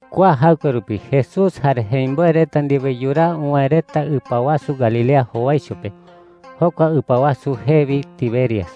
Kua jaɨkue rupi Jesús jare jemimboe reta ndiwe yuraa uwäe reta ɨpa wasu Galilea jowaicho pe. Jokua ɨpa wasu jee wi Tiberias.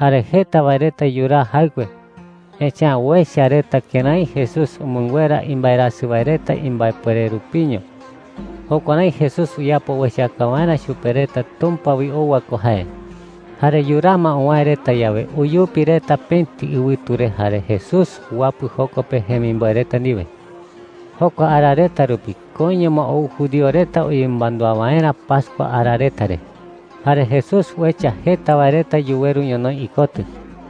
Jare jeta wae reta yuraa jaɨkue, echa’ä uecha reta kërái Jesús umɨnguera imbaerasɨ wae reta imbaepuere rupiño. Jukuärái Jesús uyapo uechaka waerä chupe reta Tumpa wi ou wae ko jae. Jare yuraa ma uwäe reta yawe, uyupi reta pëti ɨwɨtu re jare Jesús uwapɨ joko pe jemimboe reta ndiwe. Jokua ara reta rupi koiño ma ou judío reta uyemɨmandúa waerä pascua ara reta re. Jare Jesús uecha jeta wae reta yuweru ñonoï ikotɨ.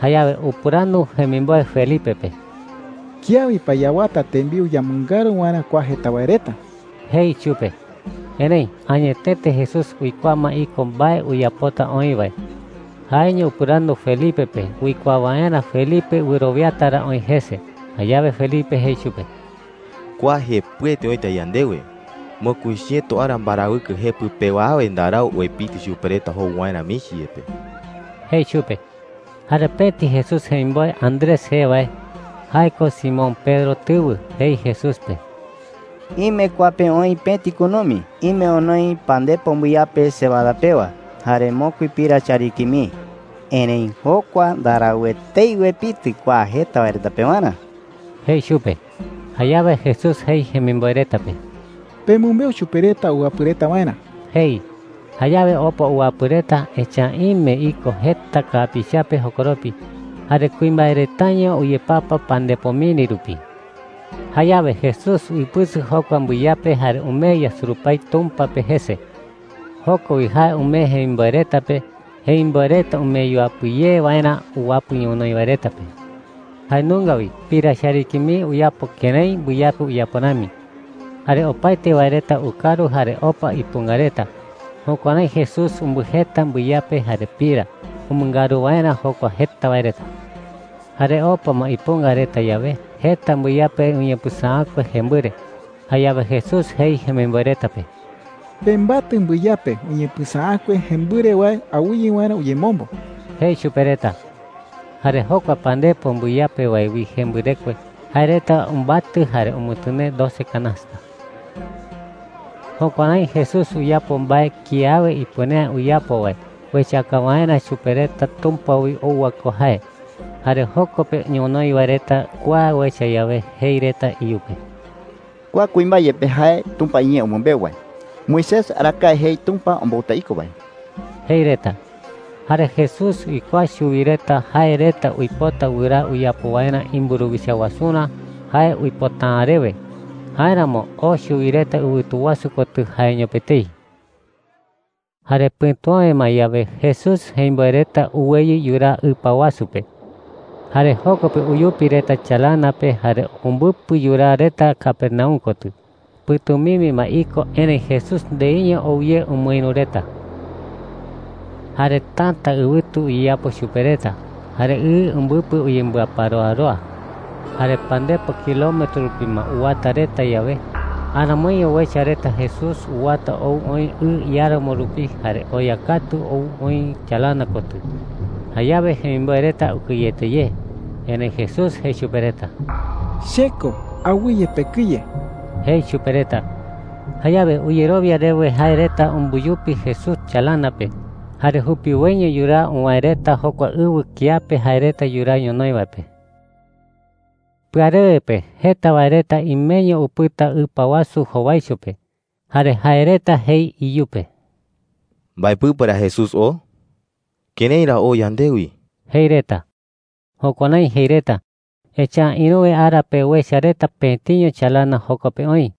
Jayawe upɨrandu jemimboe Felipe pe: “¿Kiawi pa yawata tembiu yamɨngaru waerä kua jeta wae reta?” jei chupe. Erëi añetete Jesús uikuaa ma iko mbae uyapota oï wae. Jaeño upɨrandu Felipe pe uikuaa waerä Felipe wɨrowiata ra oï jese. Jayawe Felipe jei chupe: “Kua jepɨete oïta yandewe. Mokui chiëto ara mbarawɨkɨ jepɨ pewa awe ndarau uepitɨ chupe reta jou waerä michi yepe,” jei chupe. Jare pëti Jesús jemimboe Andrés jee wae – jae ko Simón Pedro tɨwɨ – jei Jesús pe: “Ime kua pe oï pëti kunumi ime onoi pandepo mbɨyape cebada pewa jare mokui pira chariki mii. Erëi jokua ndarau etei uepitɨ kua jeta wae reta pewarä,” jei chupe. Jayawe Jesús jei jemimboe reta pe: “Pemɨmbeu chupe reta uwapɨ reta waerä,” jei. Jayawe opa uwapɨ reta, echa’ä ime iko jeta kapiichape jokoropi. Jare kuimbae retaño uyepapa pandepo miri rupi. Jayawe Jesús uipɨsɨ jokua mbɨyape jare umee yasurupái Tumpa pe jese. Joko wi jae umee jemimboe reta pe, jemimboe reta umee yuapɨ ye waerä uwapɨ ñonoï wae reta pe. Jae nunga wi pira chariki mii uyapo kërái mbɨyape uyapo rami. Jare opaete wae reta ukaru jare opa ipunga reta. Jukuärái Jesús umbɨjeta mbɨyape jare pira umɨngaru waerä jokua jeta wae reta. Jare opa ma ipunga reta yawe, jeta mbɨyape uñepɨsäakue jembɨre. Jayawe Jesús jei jemimboe reta pe: “Pembatɨ mbɨyape uñepɨsäakue jembɨre wae awɨye waerä uyemombo,” jei chupe reta. Jare jokua pandepo mbɨyape wae wi jembɨrekue, jae reta umbatɨ jare umɨtɨnee doce kanasta. Jukuärái Jesús uyapo mbae kiawe ipuere’ä uyapo wae uechaka waerä chupe reta Tumpa wi ou wae ko jae. Jare joko pe ñonoï wae reta kua uecha yawe, jei reta iyupe: “Kua kuimbae yepe jae Tumpa iñee umɨmbeu wae Moisés arakae jei Tumpa ombouta iko wae,” jei reta. Jare Jesús uikuaa chuwi reta jae reta uipota wɨraa uyapo waerä imburuwicha wasurä jae uipota’ä rewe. Jáeramo oo chuwi reta ɨwɨtu wasu kotɨ jaeño pe etei. Jare pɨ̈tu awe ma yawe, Jesús jemimboe reta uweyɨ yuraa ɨpa wasu pe. Jare joko pe uyupi reta chalana pe jare umbɨpɨ yuraa reta Capernaum kotɨ. Pɨ̈tumimbi ma iko, erëi Jesús ndeiño ou ye umɨïru reta. Jare täta ɨwɨtu uyeyapo chupe reta jare ɨ umbɨpɨ uyembɨaparoaroa. Jare pandepo kilometro rupi ma uwata reta yawe, aramoiño uecha reta Jesús uwata ou oï ɨ iáramo rupi jare oya katu ou oï chalana kotɨ. Jayawe jemimboe reta ukɨyete ye. Erëi Jesús jei chupe reta: “Che ko. Awɨye pekɨye,” jei chupe reta. Jayawe uyerowia rewe jae reta umbuyupi Jesús chalana pe. Jare jupiwoiño yuraa uwäe reta jokua ɨwɨ kiape jae reta yuraa ñonoï wae pe. Pɨarewe pe jeta wae reta imeño upɨta ɨpa wasu jowaicho pe. Jare jae reta jei iyupe: “¿Mbae pɨpe ra Jesús oo? ¿Kërái ra oo yandewi?” jei reta. Jukuärái jei reta, echa’ä ïruwe ara pe uecha reta pëtiño chalana joko pe oï,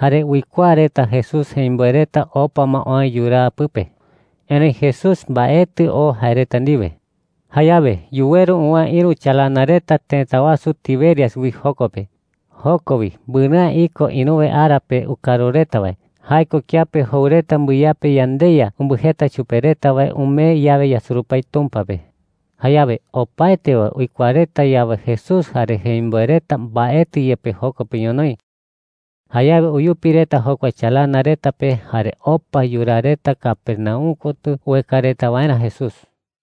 jare uikuaa reta Jesús jemimboe reta opa ma oë yuraa pɨpe. Erëi Jesús mbaetɨ oo jae reta ndiwe. Jayawe yuweru uwäe ïru chalana reta tëta wasu Tiberias wi joko pe. Joko wi mbɨrɨ'ä iko ïruwe ara pe ukaru reta wae – jae ko kiape jou reta mbɨyape yandeYa umbɨjeta chupe reta wae umee yawe yasurupái Tumpa pe. Jayawe opaete wae uikuaa reta yawe Jesús jare jemimboe reta mbaetɨ yepe joko pe ñonoï, jayawe uyupi reta jokua chalana reta pe jare opa yuraa reta Capernaum kotɨ ueka reta waerä Jesús.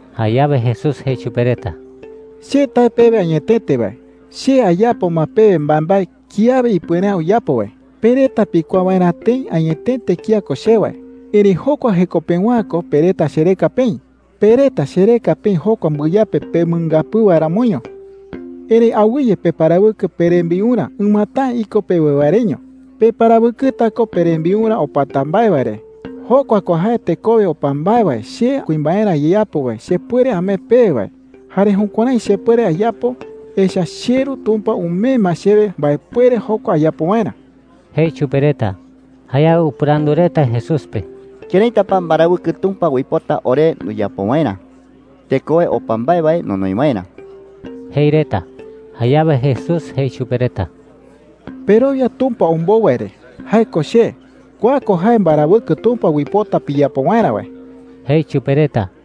Jayawe Jesús jei chupe reta: “Che tae pewe añetete wae, che ayapo ma pewe mbaembae kiawe ipuere’ä uyapo wae pe reta pikuaa waerä tëi añetete kía ko che wae. Erëi jokua jeko pewa’ä ko pe reta chereka peï. Pe reta chereka peï jokua mbɨyape pemɨngapɨɨ wae ramoño,” jei. “Erëi awɨye peparawɨkɨ perembiurä ɨmata’ä iko pewe wae reño. Peparawɨkɨta ko perembiurä opata mbae wae re – jokua ko jae tekowe opa mbae wae che kuimbaerä ayeyapo wae chepuere amee pewe wae. Jare jukuärái chepuere ayapo, echa’ä cheRu Tumpa umee ma chewe mbaepuere jokua ayapo waerä,” jei chupe reta. Jayawe upɨrandu reta Jesús pe: “¿Këraita pa mbarawɨkɨ Tumpa uipota ore nduyapo waerä tekowe opa mbae wae nonoi waerä?” jei reta. Jayawe Jesús jei chupe reta: “Perowia Tumpa ombou wae re – jae ko che. Kua ko jae mbarawɨkɨ Tumpa uipota piyapo waerä wae,” jei chupe reta.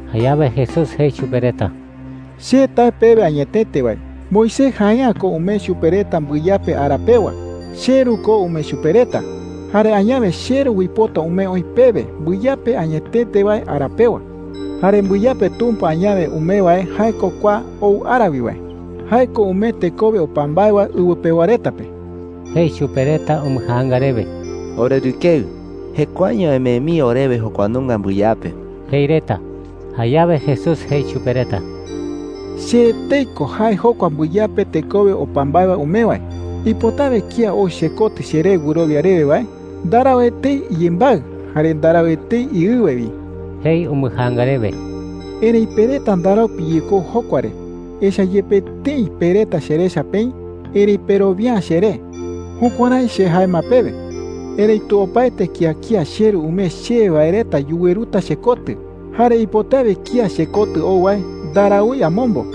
Jayawe Jesús jei chupe reta: “Che tae pewe añetete wae, Moisés jae’ä ko umee chupe reta mbɨyape ara pewa. CheRu ko umee chupe reta. Jare añawe cheRu uipota umee oï pewe mbɨyape añetete wae ara pewa. Jare mbɨyape Tumpa añawe umee wae jae ko kua ou ara wi wae. Jae ko umee tekowe opa mbae wae ɨwɨ pewa reta pe,” jei chupe reta umbɨjaanga rewe. “Orerɨkeɨ,” jei reta, “jekuaeño emee mii orewe jokua nunga mbɨyape,” jei reta. Jayawe Jesús jei chupe reta: “Che etei ko jae jokua mbɨyape tekowe opa mbae wae umee wae,” jei. “Ipotawe kía ou chekotɨ cheré wɨrowia rewe wae ndarau etei iyembaɨ jare ndarau etei iɨwe wi,” jei umbɨjaanga rewe. “Erëi pe reta ndarau piyekou jokua re, echa’ä yepe tëi pe reta cherecha peï, erëi perowia’ä cheré. Jukuärái che jae ma pewe. Erëitu opaete kía kía cheRu umee chewe wae reta yuweruta chekotɨ. Jare ipotawe kía chekotɨ ou wae ndaraúi amombo.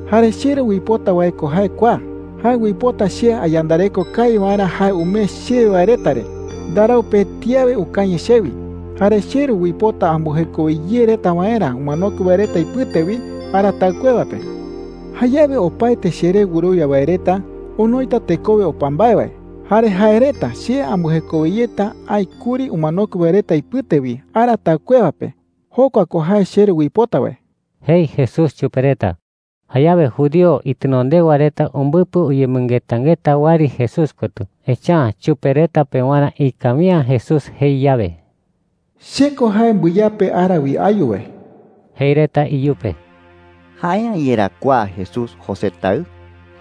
“Jare cheRu uipota wae ko jae kua: Jae uipota che ayandareko kawi waerä jae umee chewe wae reta re. Ndarau pëti awe ukañɨ chewi. Jare cheRu uipota ambɨjekowe ye reta waerä umanokue wae reta ipɨte wi ara taɨkuewa pe,” jei. “Jayawe opaete cheré wɨrowia wae reta onoita tekowe opa mbae wae. Jare jae reta che ambɨjekowe yeta aï kuri umanokue wae reta ipɨte wi ara taɨkuewa pe. Jokua ko jae cheRu uipota wae,” jei Jesús chupe reta. Jayawe judío itenondewa reta umbɨpɨ uyemɨngetangeta wɨari Jesús kotɨ. Echa’ä chupe reta pewarä ikawi’ä Jesús jei yawe: “Che ko jae mbɨyape ara wi ayu wae.” Jei reta iyupe: “¿Jae’ä yerá kua Jesús José taɨ?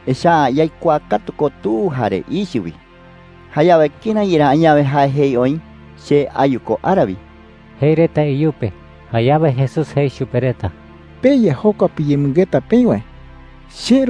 Echa’ä yaikuaa katu ko tu jare ichɨ wi. Jayawe, ¿kërái yerá añawe jae jei oï, ‘Che ayu ko ara wi’?” jei reta iyupe. Jayawe Jesús jei chupe reta: “Peya jokua piyemɨngeta peï wae,” jei.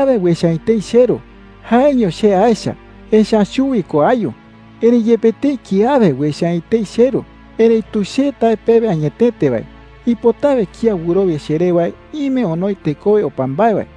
“Kiawe uecha’ä etei cheRu. Jaeño che aecha, echa’ä chuwi ko ayu. Erëi yepe tëi kiawe uecha’ä etei cheRu, erëitu che tae pewe añetete wae, ipotawe kía wɨrowia cheré wae ime onoi tekowe opa mbae wae.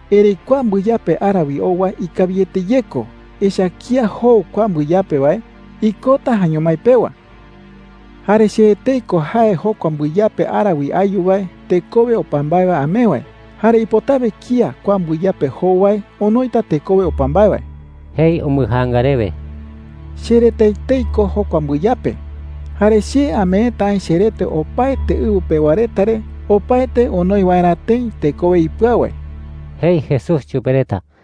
Erëi kua mbɨyape ara wi ou wae ikawiete ye ko. Echa’ä kía jou kua mbɨyape wae, ikota jaeño mái pewa,” jei. “Jare che etei ko jae jokua mbɨyape ara wi ayu wae tekowe opa mbae wae amee wae. Jare ipotawe kía kua mbɨyape jou wae onoita tekowe opa mbae wae,” jei umbɨjaanga rewe. “Cherete etei ko jae jokua mbɨyape. Jare che ameeta aï cherete opaete ɨwɨ pewa reta re opaete onoi waerä tëi tekowe ipɨau wae,” jei Jesús chupe reta.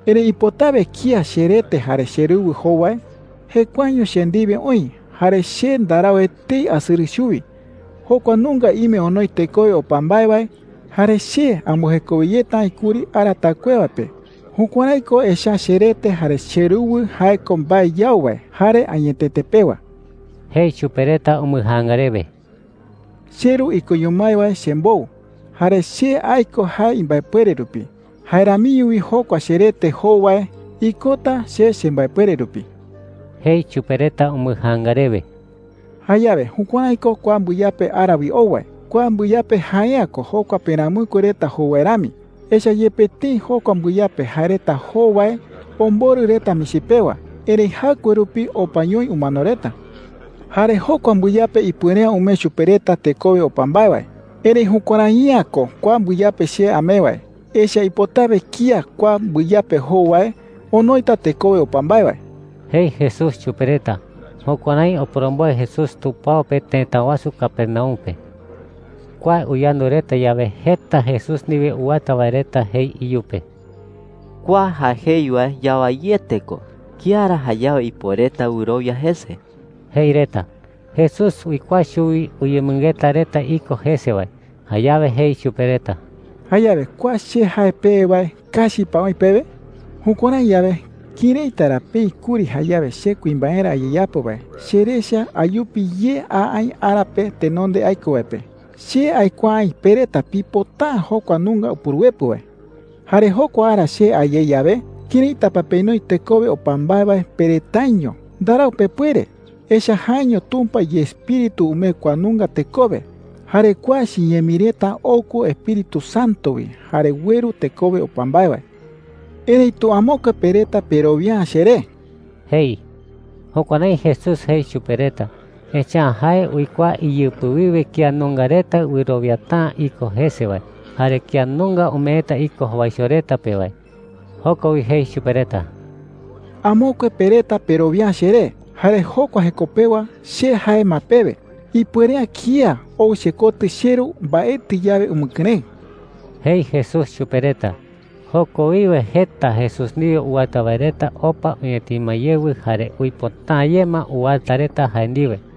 “Erëi ipotawe kía cherete jare cheruwɨ jou wae, jekuaeño che ndiwe oï, jare che ndarau etei asɨrɨ chuwi. Jokua nunga ime onoi tekowe opa mbae wae, jare che ambɨjekowe yeta aï kuri ara taɨkuewa pe. Jukuärái ko, echa’ä cherete jare cheruwɨ jae ko mbae yau wae jare añetete pewa,” jei chupe reta umbɨjaanga rewe. “CheRu ikoño mái wae chembou, jare che aiko jae imbaepuere rupi. Jae ramiño wi jokua cherete jou wae ikota che chembaepuere rupi,” jei chupe reta umbɨjaanga rewe. “Jayawe jukuärái ko kua mbɨyape ara wi ou wae. Kua mbɨyape jae’ä ko jokua peramɨkue reta jou wae rami. Echa’ä yepe tëi jokua mbɨyape jae reta jou wae omborɨ reta michi pewa, erëi jaɨkue rupi opañoi umano reta. Jare jokua mbɨyape ipuere’ä umee chupe reta tekowe opa mbae wae. Erëi jukuärai’ä ko kua mbɨyape che amee wae. Echa’ä ipotawe kía kua mbɨyape jou wae onoita tekowe opa mbae wae,” jei Jesús chupe reta. Jukuärái oporomboe Jesús tupao pe tëta wasu Capernaum pe. Kua uyandu reta yawe, jeta Jesús ndiwe uwata wae reta jei iyupe: “Kua jae jei wae yawaiete ko. ¿Kía ra jayawe ipuereta wɨrowia jese?” jei reta. Jesús uikuaa chuwi uyemɨngeta reta iko jese wae. Jayawe jei chupe reta: “¿Jayawe kua che jae pewe wae kachi pa oï pewe?” jei. “Jukuärái yawe, ¿këraita ra peï kuri jayawe che kuimbaerä ayeyapo wae cherecha ayupi ye a aï ara pe tenonde aiko wae pe? Che aikuaa aï pe reta pipota’ä jokua nunga Upuruepɨ wae,” jei chupe reta. “Jare jokua ara che a ye yawe, ¿këraita pa penoi tekowe opa mbae wae pe retaiño? Ndarau pepuere, echa’ä jaeño Tumpa iEspíritu umee kua nunga tekowe. Jare kua chiñee mii reta ou ko Espíritu Santo wi jare ueru tekowe opa mbae wae. Erëitu amokue pe reta perowia’ä cheré,” jei. Jukuärái Jesús jei chupe reta, echa’ä jae uikuaa iyɨpɨ wiwe kía nunga reta wɨrowiata’ä iko jese wae jare kía nunga umeeta iko jowaicho reta pe wae. Joko wi jei chupe reta: “Amokue pe reta perowia’ä cheré, jare jokua jeko pewa che jae ma pewe ipuere’ä kía ou chekotɨ cheRu mbaetɨ yawe umɨkɨrëɨ,” jei Jesús chupe reta. Joko wiwe jeta Jesús ndiwe uwata wae reta opa uñatima yewɨ jare uipota’ä ye ma uwata reta jae ndiwe.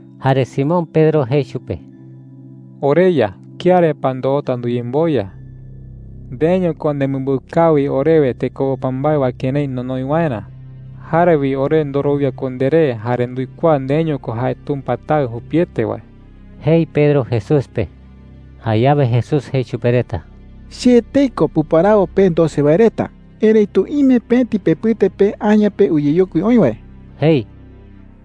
Jare Simón Pedro jei chupe: “¿OreYa, ¿kía re pa ndoota nduyemboya?” jei. “Ndeeño ko nemɨmbeu kawi orewe tekowe opa mbae wae kërái nonoi waerä. Jare wi ore ndorowia ko nderé jare nduikuaa ndeeño ko jae Tumpa Taɨ jupiete wae,” jei Pedro Jesús pe. Jayawe Jesús jei chupe reta: “Che etei ko puparawo pe doce wae reta. Erëitu ime pëti pepɨte pe aña pe uyeyokui oï wae,” jei.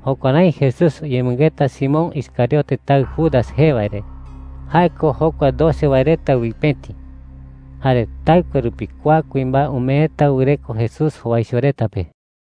Jukuärái Jesús uyemɨngeta Simón Iscariote taɨ Judas jee wae re. Jae ko jokua doce wae reta wi pëti. Jare taɨkue rupi kua kuimbae umeeta wɨreko Jesús jowaicho reta pe.